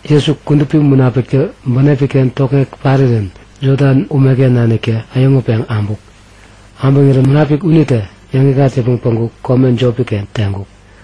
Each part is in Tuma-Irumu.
Jesu, Kudupi Munapiktä bänepi-ken tokŋeŋ parirän Jodan umeken naniktä äyäŋutpeŋ abuk. Äbäŋirän Munapik unitä yäŋikŋat yäpmäŋ päŋku kome jopi-ken teŋkuk.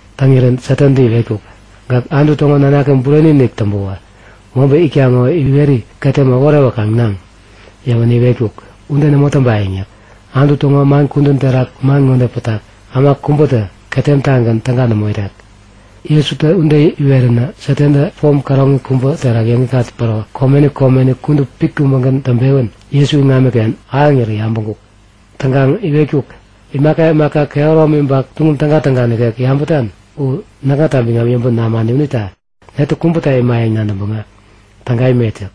Täŋirän Satantä iwetkuk; Gäk Anutu täŋo nanaki bureni-inik täŋpäwä mobä itak ŋo iweri ketem äworewänkaŋ naŋ! Yäwänä iwetkuk; Ude nämo täŋpayäŋ yäk. Anutu täŋo man kudän terak man ŋode pätak; Äma kubätä ketem-tagän täga nämo irek. Jesutä ude iweränä Satantä pom käroŋi kubä terak yäŋikŋat päro komeni komeni kudup pit kubägän täŋpewän Jesu iŋamiken ahäŋirä yabäŋkuk. Täŋkaŋ iwetkuk; Imaka imaka kehäromi ba tuŋum tägatäga nikek yabätan u näkŋata biŋam yäŋpäŋ namani unita netä kubäta imayäŋ nadäŋpäŋ täga imet yäk.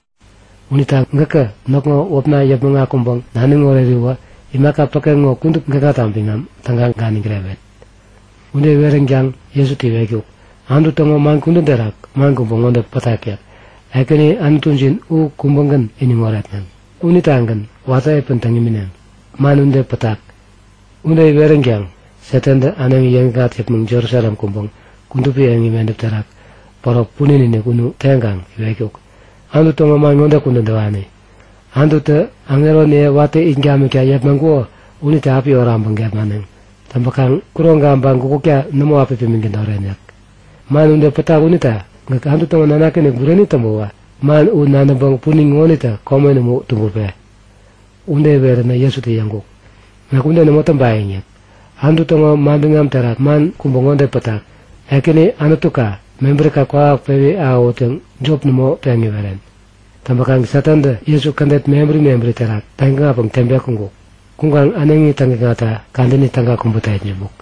Unita gäkä näkŋo wäpna yäpmäŋ akuŋpäŋ naniŋ oreriwä imaka päke ŋo kudup gäkŋata biŋam täga ganiŋ kirewet. Ude iweränkaŋ Jesutä iwetkuk; Anutu täŋo man kudän terak man kubä ŋode pätak yäk. Ekäni Anutujin u kubägän iniŋ oretneŋ. Unitagän watä piä täŋ imineŋ. Man ude pätak. Ude iweränkaŋ Satantä äneŋi yäŋikŋat yäpmäŋ Jerusalem kuŋpäŋ kudupi eŋi medäp terak päro punin-inik unu teŋkaŋ iwetkuk; Anutu täŋo man ŋode kudän täwani; Anututä aŋeroniye watä it gamikta yepmaŋkuko unitä api oraŋpäŋ gepmaneŋ. Täŋpäkaŋ kuroŋka ba gukutka nämo api pimiŋ tädoren yäk. Man ude pätak unita gäk Anutu täŋo nanaki-inik bureni täŋpäwä man u nadäŋpäŋ punin ŋonitä komen umu tubäpe! Ude iweränä Jesutä yäŋkuk; Näk ude nämo täŋpayäŋ yäk. Anutu täŋo manbiŋam terak man kubä ŋode pätak; Ekäni Anutuka mebärika kwawak pewi ahäwut yäŋ jop nämo peŋ iweren. Täŋpäkaŋ Satantä Jesu kädet mebäri mebäri terak täŋ-ikŋatpäŋ teŋpeŋ kuŋkuk. Kuŋkaŋ äneŋi täŋikŋatta kadäni täga kubäta itsämbuk.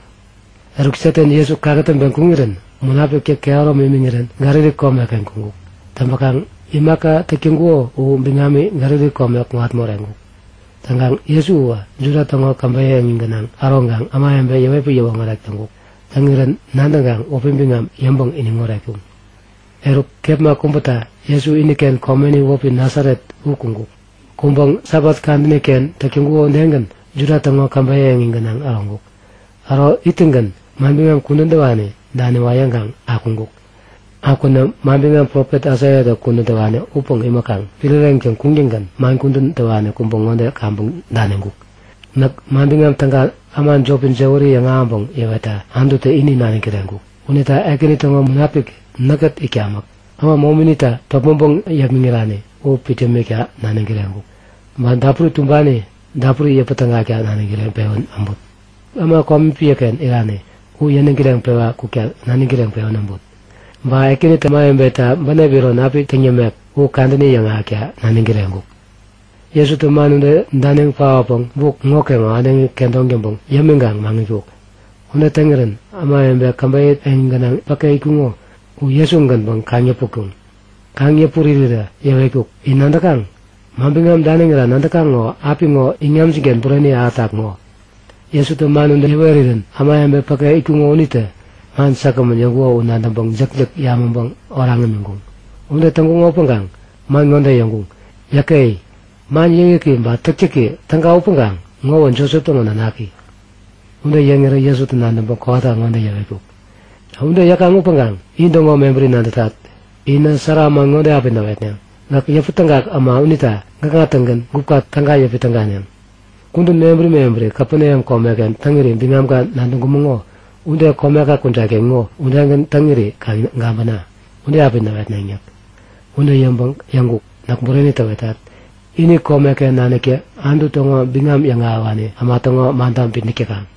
Eruk Satan Jesu kakätäŋpeŋ kuŋirän Munapiktä kehäromi imiŋirän Galili komeken kuŋkuk. Täŋpäkaŋ imaka täk täŋkuko u biŋami Galili kome kuŋat moreŋkuk. Täŋkaŋ Jesu uwä Juda täŋo käbeyä eŋi gänaŋ äroŋkaŋ ämawebe yäwetpäŋ yäwoŋärek täŋkuk. Täŋirän nadäŋkaŋ wäpi biŋam yäŋpäŋ iniŋoret täŋkuŋ. Eruk, kepma kubäta Jesu iniken komeni wäpi Nasaret u kuŋkuk. Kuŋpäŋ Sabat kadäni-ken täk täŋkuko udegän Juda täŋo käbeyä eŋi gänaŋ äroŋkuk. Äro ittäŋgän manbiŋam kudän täwani daniwa yäŋkaŋ akuŋkuk. Akwänä manbiŋam profet Aisaiatä kudän täwani upäŋ imäkaŋ piräreyäŋtäŋ kuŋtäŋgän man kudän täwani kubä ŋode kaŋpäŋ daniŋkuk; Näk Manbiŋam Täga äma jopi jäwäri yäŋahäŋpäŋ yäwetta Anututä ini naniŋ kireŋkuk. Unita Ekäni täŋo Munapik näkkät itkamäk. Äma mominitä topmäŋpäŋ yepmäŋirani u pit yämikta naniŋ kireŋkuk. Ba dapuri tumbani dapuri yäpä tägakta naniŋ kireŋpewän äbut. Äma komi piäken irani u yäniŋ kireŋpewa kukta naniŋ kireŋpewän äbut. Ba Ekänitä ämawebeta bänep iron api täŋ yämek u kadäni yäŋahäkta naniŋ kireŋkuk. Jesutä man ude daniŋ paotpäŋ buk ŋokeŋo äneŋi kedoŋ täŋpäŋ yämiŋkaŋ maŋitkuk. Ude täŋirän ämawebe käbeyä eŋi gänaŋ päke itkuŋo u Jesu-gänpäŋ kaŋ-yäputkuŋ. Kaŋ-yäput irirä yäwetkuk; In nadäkaŋ? Manbiŋam daniŋira nadäkaŋ ŋo apiŋo iŋamjin-ken bureni ahätak ŋo! Jesutä man ude yäwerirän ämawebe päke itkuŋo unitä man säkgämän yäŋkuko u nadäŋpäŋ jäkjäk yamäŋpäŋ oraŋ imiŋkuŋ. Ude täŋkuŋo upäŋkaŋ man ŋode yäŋkuŋ; Yäke! Man yäkyäki ba täktäki täga upäŋkaŋ ŋowä Josep täŋo nanaki! Ude yäŋirä Jesutä nadäŋpäŋ kowata ŋode yäwetkuk; Ude yäkaŋ upäŋkaŋ intäŋo mebäri nadätat. Inä sära man ŋode api näwetneŋ; Gäk yäpätägak äma unita gäkŋa-tägän gupka täga yäpi täganeŋ. Kudän mebäri mebäri Kapeneam komeken täŋiri biŋamka nadäŋkumäŋo ude komeka kujat-ken ŋo udegän täŋiri kaŋ gabäna! Ude api näwetneŋ yäk. Ude yäŋpäŋ yäŋkuk; Näk bureni täwetat. Ini komeken naniktä Anutu täŋo biŋam yäŋahäwani äma täŋo manita bitnäk täkaŋ.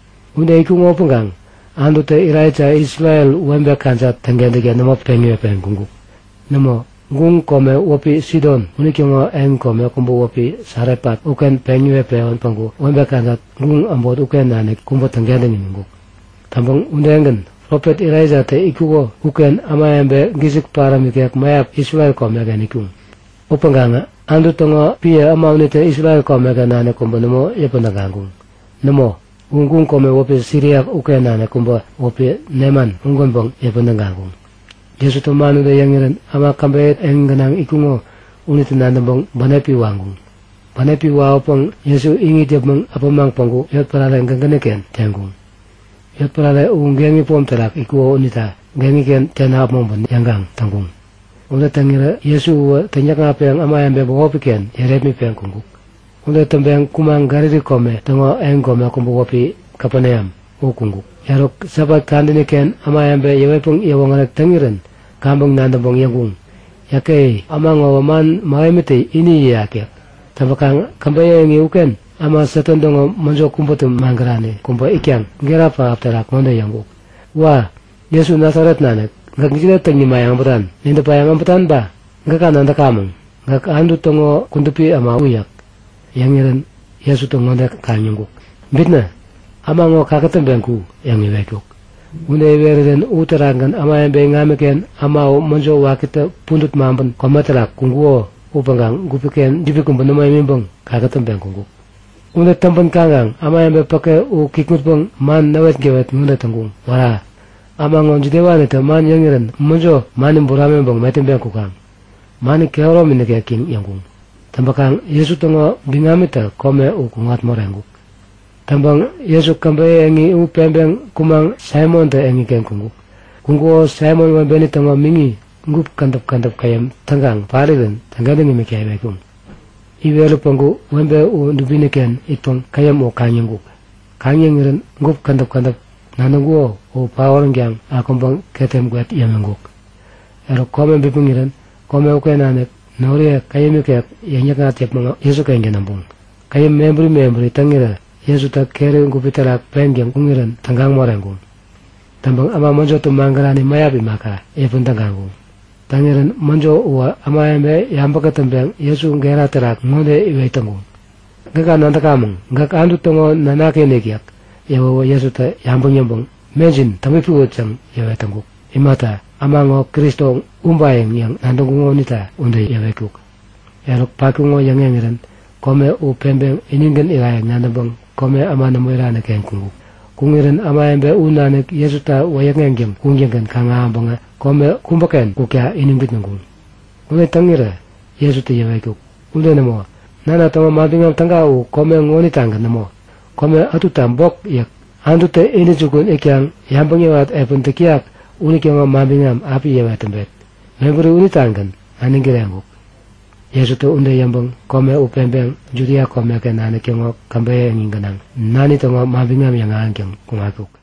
Ude itkuŋo upäŋkaŋ Anututä Elaija Isrel webe kajat täŋkentäkta nämo peŋ iwet-pewän kuŋkuk. Nämo, guŋ kome wäpi Sidon unitäŋo yotpärare kubä wäpi Sarefat uken peŋ iwet-pewän päŋku webe kajat guŋ äbot uken nanik kubä täŋkentäŋ imiŋkuk. Täŋpäŋ udegän, Profet Elaijatä itkuko uken ämawebe gisik paräm ikek mäyap Isrel komeken itkuŋ. Upäŋkaŋä Anutu täŋo piä äma unitä Isrel komeken nanik kubä nämo yäpän tägaŋkuŋ. Nämo, u guŋ kome wäpi Siria uken nanik kubä wäpi Neman ugänpäŋ yäpän tägaŋkuŋ. Jesutä man ude yäŋirän äma käbeyä eŋi gänaŋ itkuŋo unitä nadäŋpäŋ bänepi waŋkuŋ. Bänepi wawäpäŋ Jesu iŋit yäpmäŋ äpämaŋ päŋku yotpärare gägäni-ken teŋkuŋ. Yotpärare u geŋi pom terak itkuko unita geŋi-ken tena äpmoŋpän yäŋkaŋ täŋkuŋ. Ude täŋirä Jesu uwä täŋyäkŋatpeŋ ämawebe bämopi-ken yärepmitpeŋ kuŋkuk. Ude täŋpeŋ kumaŋ Galili kome täŋo yotpärare kubä wäpi Kapeneam u kuŋkuk. Eruk, Sabat kadäni-ken ämawebe yäwetpäŋ yäwoŋärek täŋirän kaŋpäŋ nadäŋpäŋ yäŋkuŋ; Yäke! Äma ŋowä man mähemitä ini yäyak yäk. Täŋpäkaŋ käbeyä eŋi uken äma Satan täŋo mäjo kubätä magärani kubä itkaŋ gera pähap terak ŋode yäŋkuk; Wa! Jesu Nasaret nanik, gäk jide täŋ nimayäŋ äbätan? Nidäpayäŋ äbätan ba? Gäka nadäkamäŋ, gäk Anutu täŋo Kudupi äma u yäk. Yäŋirän Jesutä ŋode kaŋ-yäŋkuk; Bitnä! Äma ŋo kakätäŋpeŋ ku! yäŋ iwetkuk. Ude iwerirän uterakgän ämawebe iŋamiken äma u mäjo wakitä pudät maŋpän kome terak kuŋkuko upäŋkaŋ gupi-ken jibi kubä nämo imiŋpäŋ kakätäŋpeŋ kuŋkuk. Ude täŋpän kaŋkaŋ ämawebe päke u kikŋutpäŋ man näwetgäwet ŋode täŋkuŋ; Wära! Äma ŋo jidewanitä man yäŋirän mäjo mani buramiŋpäŋ metäŋpeŋ kukaŋ? Mani kehäromi nikek yäŋ yäŋkuŋ. Täŋpäkaŋ Jesu täŋo biŋamitä kome u kuŋat moreŋkuk. Täŋpäŋ Jesu käbeyä eŋi u peŋpeŋ kumaŋ Saimontä eŋiken kuŋkuk. Kuŋkuko Saimon webeni täŋo miŋi gup kädäp kädäp käyäm täŋkaŋ parirän täŋkentäŋ imikta iwetkuŋ. Iwerä päŋku webe u dubini-ken itpäŋ käyäm u kaŋ-yäŋkuk. Kaŋ-yäŋirän gup kädäp kädäp nadäŋkuko u paoränkaŋ akuŋpäŋ ketem gwet yämiŋkuk. Eruk, kome bipmäŋirän kome uken nanik noriye käyäm ikek yäŋ-yäkŋat yäpmäŋ Jesu-kengän äbuŋ. Käyäm mebäri mebäri täŋirä Jesutä keri gupi terak peŋtäŋ kuŋirän tägaŋ moreŋkuŋ. Täŋpäŋ äma mäjotä magärani mäyap imaka, yäpän tägaŋkuŋ. Täŋirän mäjo uwä ämawebe yabä-kätäŋkaŋ Jesu gera terak ŋode iwet täŋkuŋ; Gäka nadäkamäŋ. Gäk Anutu täŋo Nanaki-inik yäk. Yäwäwä Jesutä yabäŋ yäŋpäŋ Mejin täŋpipiwut! yäŋ yäwet täŋkuk. Imata, Äma ŋo Kristo ubayäŋ yäŋ nadäŋkuŋo unita ude yäwetkuk. Eruk patkuko yäŋeŋirän kome u peŋpeŋ inigän irayäŋ nadäŋpäŋ kome äma nämo irani-ken kuŋkuk. Kuŋirän ämawebe u nanik Jesuta wäyäkŋeŋtäŋ kuŋtäŋgän kaŋ-ahäŋpäŋä kome kubäken kukta iniŋ bitnäŋkuŋ. Ude täŋirä Jesutä yäwetkuk; Ude nämo! Nana täŋo Manbiŋam Täga u kome ŋonitagän nämo. Kome ätuta bok yäk. Anututä intäjukun itkaŋ yabäŋ yäwat piä täk täyak unitäŋo manbiŋam api yäwet täŋpet. Mebäri unitagän naniŋ kireŋkuk. Jesutä ude yäŋpäŋ kome u peŋpeŋ Judia komeken nanik täŋo käbeyä eŋi gänaŋ Nani täŋo manbiŋam yäŋahäŋtäŋ kuŋatkuk.